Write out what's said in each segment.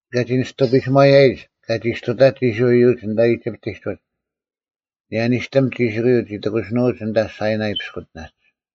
ᑲᒋ ᓂᔅᑐ ᐱᓯᒺᔭᔨᒡ ᑲ ᒋᔅᑐᑕᒡ ᐃᔅᕋᐃᓪ ᐃᔪᒡ ᐊᓐᑕ ᐃᒋᑉᑎᒡ ᐅᒡ, ᐊᓂᔭ ᓂᔅᑎᒻ ᒋᓯᑯᔪᐤ ᒋ ᑎᑯᓯᓄᐅᒡ ᐊᓐᑕ ᓴᐃᓇᐃ ᐱᔅᑯᑎᓇᒡ᙮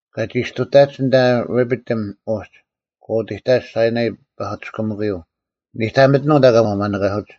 ᑲᒋ ᒋᔅᑐᑕᒡ ᐊᓐᑕ ᕆᐱᑎᒻ ᐅᒡ, ᒂ ᐅᑎᑕᒡ ᓴᐃᓇᐃ ᐸᐧᑯᑎᔅᑭᒥᑯᔪᐤ, ᓂᑕᒥᑎᓄᐤ ᐊᓐᑕ ᒂ ᒪᓂᑲᓱᒡ᙮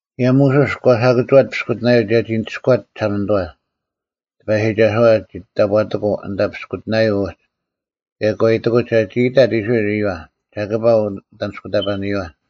ᑭᔭ ᒧᓱᔅ ᒂ ᓴᑭᒋᐛᑦ ᐱᔅᑯᑎᓇᔪᐤ ᒐᒋ ᓂᒋᔅᑯᐛᑦ ᒋᓴᒪᓂᑐᐛ᙮ ᑎᐸᔨᒋᒐᓱᐛ ᒋ ᑕᑈᑎᑯᐤ ᐊᓐᑕ ᐱᔅᑯᑎᓇᔪᐤ ᐅᒡ ᑭᔭ ᒂ ᐃᑎᑯᑦ ᒐᒋ ᐃᑕᑦ ᐃᔅᕋᐃᓪ ᐃᔪᐛ, ᒐᑭᐸ ᐅᑦ ᐊᓂᔅᑯᑕᐸᓂᔪᐛ,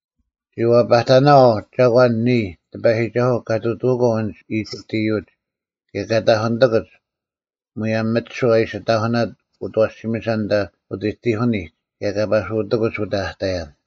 “ ‘ᔅᒋ ᐛᐸᑕᓇᐛᐤ ᒐᒂᓐ ᓂᔾ, ᑎᐸᔨᒋᒐᓱᐤ, ᑲ ᑐᑐᐅᒂᐤ ᐊᓐᒡ ᐃᒋᑉᑦ ᐃᔪᒡ ᑭᔭ ᑲ ᑕᐧᑯᓂᑎᑯᒡ ᒧᔭᒻ ᒥᒋᓱᐤ ᐊ ᐃᓯ ᑕᐧᑯᓇᑦ ᐅᑦ ᐊᐛᓯᒥᓴ ᐊᓐᑕ ᐅᑎᑎᑭᓂᒡ ᑭᔭ ᑲ ᐸᓱᑎᑯᒡ ᐅᑕ ᐊᑕᔭᓐ᙮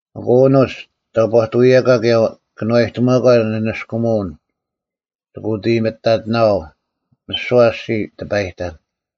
ᐊᑯ ᐊᓄᒡ, ᑕᑈᑐᐅᔭᒂ ᑭᔭ ᑭᓄᐛᔨᑎᒪᒂ ᓂᓂᔅᑯᒧᐅᓐ, ᒋᑭ ᐅᑦ ᐃᔨᒥᑕᑎᓇᐛᐤ᙮ ᒥᓯᐛ ᐊᔅᒋᔾ ᓂ ᑎᐸᔨᑕᓐ᙮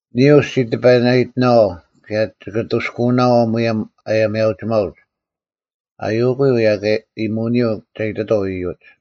ᓂᔾ ᐅ ᔅᒋ ᑎᐸᓇᐃᑎᓇᐛᐤ ᑭᔭ ᒋᑭ ᐊᑐᔅᑯᓇᐛᐤ ᒧᔭᒻ ᐊᔭᒥᐊᐅᒋᒪᐅᒡ,’ ᐊᐅᑯᔪᐤ ᐅᔭ ᐃᔨᒧᐅᓂᔪᐤ ᒐ ᐃᑎᑥᐤ ᐃᔪᒡ᙮”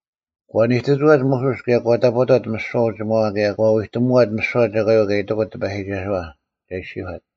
ᒂ ᓂᑎᒋᐛᑦ ᒧᓱᔅ ᑭᔭ ᒂ ᑕᑈᑕᑦ ᒥᓯᐛ ᐅᒋᒪᐛ ᑭᔭ ᒂ ᐎᑎᒧᐛᑦ ᒥᓯᐛ ᒐᒂᔪᐤ ᑲ ᐃᑎᑯᑦ ᑎᐸᔨᒋᒐᓱᐛ ᒐ ᐃᔅᒋᔄᑦ᙮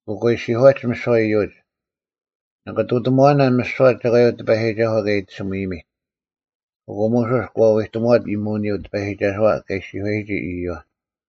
ᐊᑯ ᒂ ᐃᔅᒋᔄᒡ ᒥᓯᐛ ᐃᔪᒡ, “ᓂᑭ ᑐᑕᒺᓇᓐ ᒥᓯᐛ ᒐᒂᔪᐤ ᑎᐸᔨᒋᒐᓱᐤ ᑲ ᐃᑎᓱᒥᔨᒥᑦ᙮” ᐊᑯ ᒧᓱᔅ ᒂ ᐎᑎᒧᐛᑦ ᐃᔨᒧᓂᔪᐤ ᑎᐸᔨᒋᒐᓱᐛ ᑲ ᐃᔅᒋᔄᔨᒋ ᐃᔪᐛ᙮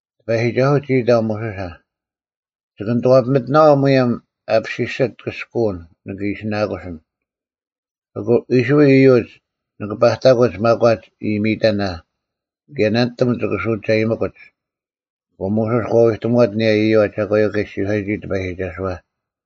ᑎᐸᔨᒋᒐᓱᐤ ᒋ ᐃᑕᐤ ᒧᓱᓴ, “ᒋᑭ ᓂᑐᐛᐱᒥᑎᓇᐛᐤ ᒧᔭᒻ ᐊ ᒋᔅᐱᒋᓯᑦ ᑭᔅᑯᐅᓐ ᓂᑭ ᐃᓯᓇᑯᓯᓐ, ᐊᑯ ᐃᔅᕋᐃᓪ ᐃᔪᒡ ᓂᑭ ᐸᑕᑯᒡ ᒪᒂᒡ ᐃᔨᒥᔨᑕᓇ ᑭᔭ ᓇᓂᑎᒻ ᒋᑭ ᓱᒐᔨᒥᑯᒡ᙮” ᐊᑯ ᒧᓱᔅ ᒂ ᐎᑎᒧᐛᑦ ᐊᓂᔭ ᐃᔪᐛ ᒐᒂᔪᐤ ᑲ ᐃᔅᒋᔄᔨᒋ ᑎᐸᔨᒋᒐᓱᐛ᙮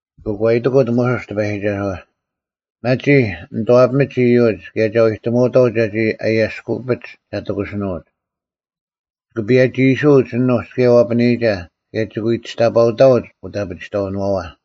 ᐊᑯ ᒂ ᐃᑎᑯᑦ ᒧᓱᔅ ᑎᐸᔨᒋᒐᓱᐛ, “ᒪᒋ ᓂᑐᐛᐱᒥᒡ ᐃᔪᒡ ᑭᔭ ᒐ ᐎᑎᒧᐅᑥᐤ ᒐᒋ ᐊᔭᔅᑯᐱᒡ ᒐ ᑎᑯᓯᓄᐅᒡ᙮ ᒋᑭ ᐸᔭᒋᐃᓱᐅᒡ ᐊᓄᒡ ᑭᔭ ᐛᐱᓂᒐ ᑭᔭ ᒋᑭ ᐎ ᒋᔅᑕᐸᐅᑕᐅᒡ ᐅᑦ ᐊᐱᒋᑕᐅᓄᐛᐛ᙮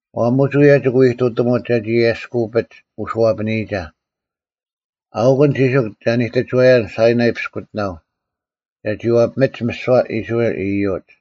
ᐛᒧᒡ ᐅᔭ ᒋᑭ ᐎ ᐃᑐᑎᒧᒡ ᒐᒋ ᐊᔭᔅᑯᐱᒡ ᐅᓱᐛᐱᓂᔨᒐ᙮ ᐊᐅᑯᓐ ᒋᓱᒄ ᒐ ᓂᑎᒋᐛᔭᓐ ᓴᐃᓇᐃ ᐱᔅᑯᑎᓇᐤ ᒐᒋ ᐛᐱᒥᒡ ᒥᓯᐛ ᐃᔅᕋᐃᓪ ᐃᔪᒡ᙮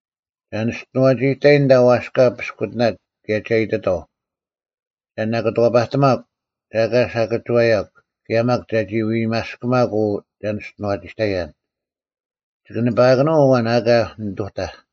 ᒐ ᓂᔅᑐᐛᒋᑕᔨᓐ ᐊᓐᑕ ᐛᔅᑲ ᐱᔅᑯᑎᓇᒡ ᑭᔭ ᒐ ᐃᑎᑥᐤ, ᒐ ᓇᑭᑐᐛᐸᑎᒪᒃ ᒐ ᐊᑲ ᓴᑭᒋᐛᔭᒃ ᑭᔭ ᒪᒃ ᒐᒋ ᐎᒪᔅᑭᒪᒄ ᐅ ᒐ ᓂᔅᑐᐛᒋᑕᔭᓐ᙮ ᒋᑭ ᓂᐸᐊᑭᓄᐤ ᐊᐛᓐ ᐊᑲ ᓂᑐᑕᐧᒃ᙮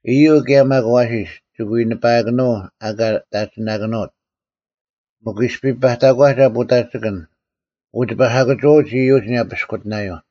ᐃᔪᐤ ᑭᔭ ᒪᒃ ᐊᐛᓯᔅ, ᒋᑭ ᐎ ᓂᐸᐊᑭᓄᐤ ᐊ ᐊᑲ ᑕᒋᓇᑭᓄᐅᑦ᙮ ᒥᒄ ᐃᔅᐱ ᐸᑕᒂᒐ ᐳᑕᒋᑭᓐ, ᐊᑯ ᒋᐸ ᓴᑭᒋᐛᐅᒡ ᐃᔪᒡ ᐊᓂᔭ ᐸᐃᔅᑯᑎᓇᔪᐤ᙮”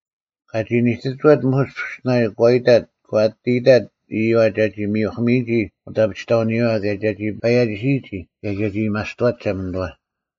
ᑲᒋ ᓂᑎᒋᐛᑦ ᒧᓱᔅ ᐱᔅᑯᑎᓇᔪᐤ, ᒂ ᐊᑎ ᐃᑕᑦ ᐃᔪᐛ ᒐᒋ ᒥᔪᐧᑭᒥᔨᒋ ᐅᑦ ᐊᐱᒋᑕᐅᓂᔪᐛ ᑭᔭ ᒐᒋ ᐸᔭᒋᓯᔨᒋ ᑭᔭ ᒐᒋ ᐊᔭᒥᐊᔅᑐᐛᒡ ᒋᓴᒪᓂᑐᐛ᙮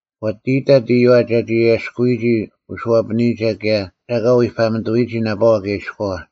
ᒂ ᐊᑎ ᐃᑕᑦ ᐃᔪᐛ ᒐᒋ ᐊᔭᔅᑯᐎᒋ ᐅᓱᐛᐱᓂᔨᒐ ᑭᔭ ᒐ ᐊᑲ ᐎᐸᒥᑐᐎᔨᒋ ᓇᐸᐛ ᑭᔭ ᐃᔎᐛ᙮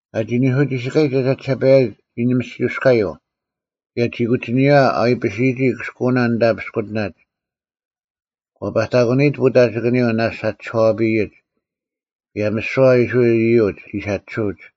ᑲᒋ ᓂᓱ ᒋᓯᑲᔨᒡ ᐊ ᒐᒋᓴᐸᔭᒡ ᒋ ᓂᒥᔅᒋᐅᔅᔎᔪᐤ, ᑭᔭ ᒋ ᑯᒋᓂᔪᐛ ᐊ ᐎᐱᓯᔨᒋ ᑭᔅᑯᐅᓇ ᐊᓐᑕ ᐱᔅᑯᑎᓇᒡ᙮ ᒂ ᐸᑕᑯᓂᔨᒡ ᐳᑕᒋᑭᓂᔪᐤ ᓇᔅᒡ ᐊ ᒋᔄᐱᔨᒡ, ᑭᔭ ᒥᓯᐛ ᐃᔅᕋᐃᓪ ᐃᔪᒡ ᒋᓴᒋᓱᐅᒡ᙮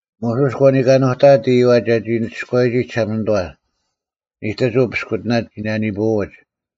ᒧᓱᔅ ᒂ ᓂᑲᓄᑕᐊᑦ ᐃᔪᐛ ᒐᒋ ᓂᒋᔅᑯᐛᔨᒋ ᒋᓴᒪᓂᑐᐛ, ᓂᑎᒍᐤ ᐱᔅᑯᑎᓇᒡ ᒋ ᓇᓂᐳᐎᒡ᙮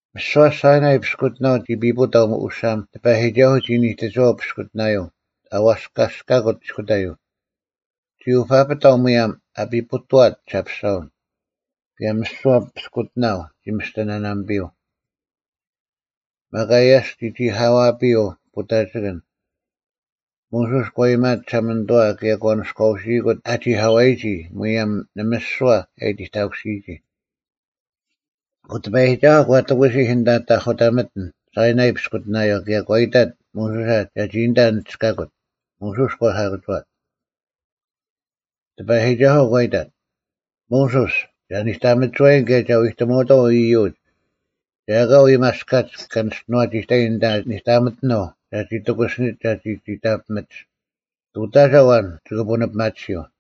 ᒥᓯᐛ ᓴᐃᓇᐃ ᐱᔅᑯᑎᓇᐤ ᒋ ᐱᐳᑕᐤ ᐅᓴᒻ ᑎᐸᔨᒋᒐᓱᐤ ᒋ ᓂᑎᒋᐛᐤ ᐱᔅᑯᑎᓇᔪᐤ ᐊᐛᔅᑲᔅᑲᑯᑦ ᐃᔅᑯᑕᔪᐤ᙮ ᒋ ᐅᐸᐱᑕᐤ ᒧᔭᒻ ᐊ ᐱᐳᑥᑦ ᒋᓴᐱᔅᒐᐛᓐ, ᑭᔭ ᒥᓯᐛ ᐱᔅᑯᑎᓇᐤ ᒋ ᒥᔅᑎ ᓇᓇᒥᐱᔪᐤ᙮ ᒪᒃ ᐊᔭᔅᒄ ᒋ ᒋᐧᑲᐛᐱᔪᐤ ᐳᑕᒋᑭᓐ᙮ ᒧᓱᔅ ᒂ ᐃᔨᒪᐊᑦ ᒋᓴᒪᓂᑐᐛ ᑭᔭ ᒂ ᓂᔎᐅᓯᐃᑯᑦ ᐊ ᒋᐧᑲᐛᔨᒋ ᒧᔭᒻ ᓂᒥᔅᒍᐛ ᐊ ᐃᑎᑕᑯᓯᔨᒋ᙮ ᐊᑯ ᑎᐸᔨᒋᒐᓱᐤ ᒂ ᑎᑯᓯᐧᒃ ᐊᓐᑕ ᑕᐧᑯᑕᒥᑎᓐ ᓴᐃᓇᐃ ᐱᔅᑯᑎᓇᔪᐤ ᑭᔭ ᒂ ᐃᑕᑦ ᒧᓱᓴ ᒐᒋ ᐊᓐᑕ ᓂᒋᔅᑲᑯᑦ᙮ ᒧᓱᔅ ᒂ ᓴᑭᒋᐛᑦ᙮ ᑎᐸᔨᒋᒐᓱᐤ ᒂ ᐃᑕᑦ, “ᒧᓱᔅ, ᒐ ᓂᑕᒥᒋᐛᔨᓐ ᑭᔭ ᒐ ᐎᑎᒧᐅᑥᐤ ᐃᔪᒡ ᒐ ᐊᑲ ᐎᒪᔅᑲᒡ ᑲ ᓂᔅᑐᐛᒋᑕᔨᓐ ᐊᓐᑕ ᓂᑕᒥᑎᓄᐤ ᒐᒋ ᑎᑯᓯᓂᒡ ᒐᒋ ᒋᑕᐱᒥᒡ; ᑐᑕᒐ ᐊᐛᓐ ᒋᑭ ᐳᓂᐱᒪᑎᓯᔪᐤ᙮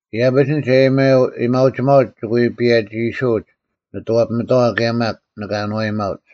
ᐃᔭᐱᒡ ᐊᓐᒡ ᐊᔭᒥᐊᐅᒋᒪᐅᒡ ᒋᑭ ᐎ ᐸᔭᒋᐃᓱᐅᒡ ᓂᑐᐛᐱᒥᑥᐛ ᑭᔭ ᒪᒃ ᓂᑭ ᐊᓏᔨᒪᐅᒡ᙮”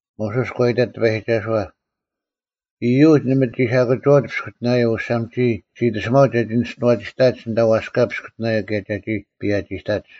ᒧᓱᔅ ᒂ ᐃᑕᑦ ᑎᐸᔨᒋᒐᓱᐛ, “ᐃᔪᒡ ᓇᒪ ᒋ ᓴᑭᒋᐛᐅᒡ ᐱᔅᑯᑎᓇᔪᐤ ᐅᓴᒻ ᒋᔾ ᔅᒋ ᐃᑎᓱᒪᐅᒡ ᒐᒋ ᓂᔅᑐᐛᒋᑕᒡ ᐊᓐᑕ ᐛᔅᑲ ᐱᔅᑯᑎᓇᔪᐤ ᑭᔭ ᒐᒋ ᐸᔭᒋᑕᒡ᙮”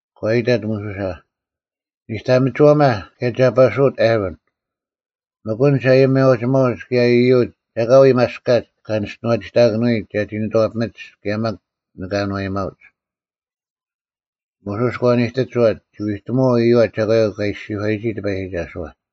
ᒂ ᐃᑕᑦ ᒧᓱᓴ, “ᓂᑕᒥᒋᐛᒪ ᑭᔭ ᒐ ᐸᓱᐅᑦ ᐊᕋᓐ᙮ ᒥᒄ ᐊᓐᒡ ᐊᔭᒥᐊᐅᒋᒪᐅᒡ ᑭᔭ ᐃᔪᒡ ᒐ ᐊᑲ ᐎᒪᔅᑲᒡ ᑲ ᓂᔅᑐᐛᒋᑕᑭᓄᐎᒡ ᒐᒋ ᓂᑐᐛᐱᒥᒡ ᑭᔭ ᒪᒃ ᓂᑭ ᐊᓏᔨᒪᐅᒡ᙮” ᒧᓱᔅ ᒂ ᓂᑕᒥᒋᐛᑦ, ᒋ ᐎᑎᒧᐛᐤ ᐃᔪᐛ ᒐᒂᔪᐤ ᑲ ᐃᔅᒋᔄᔨᒋ ᑎᐸᔨᒋᒐᓱᐛ᙮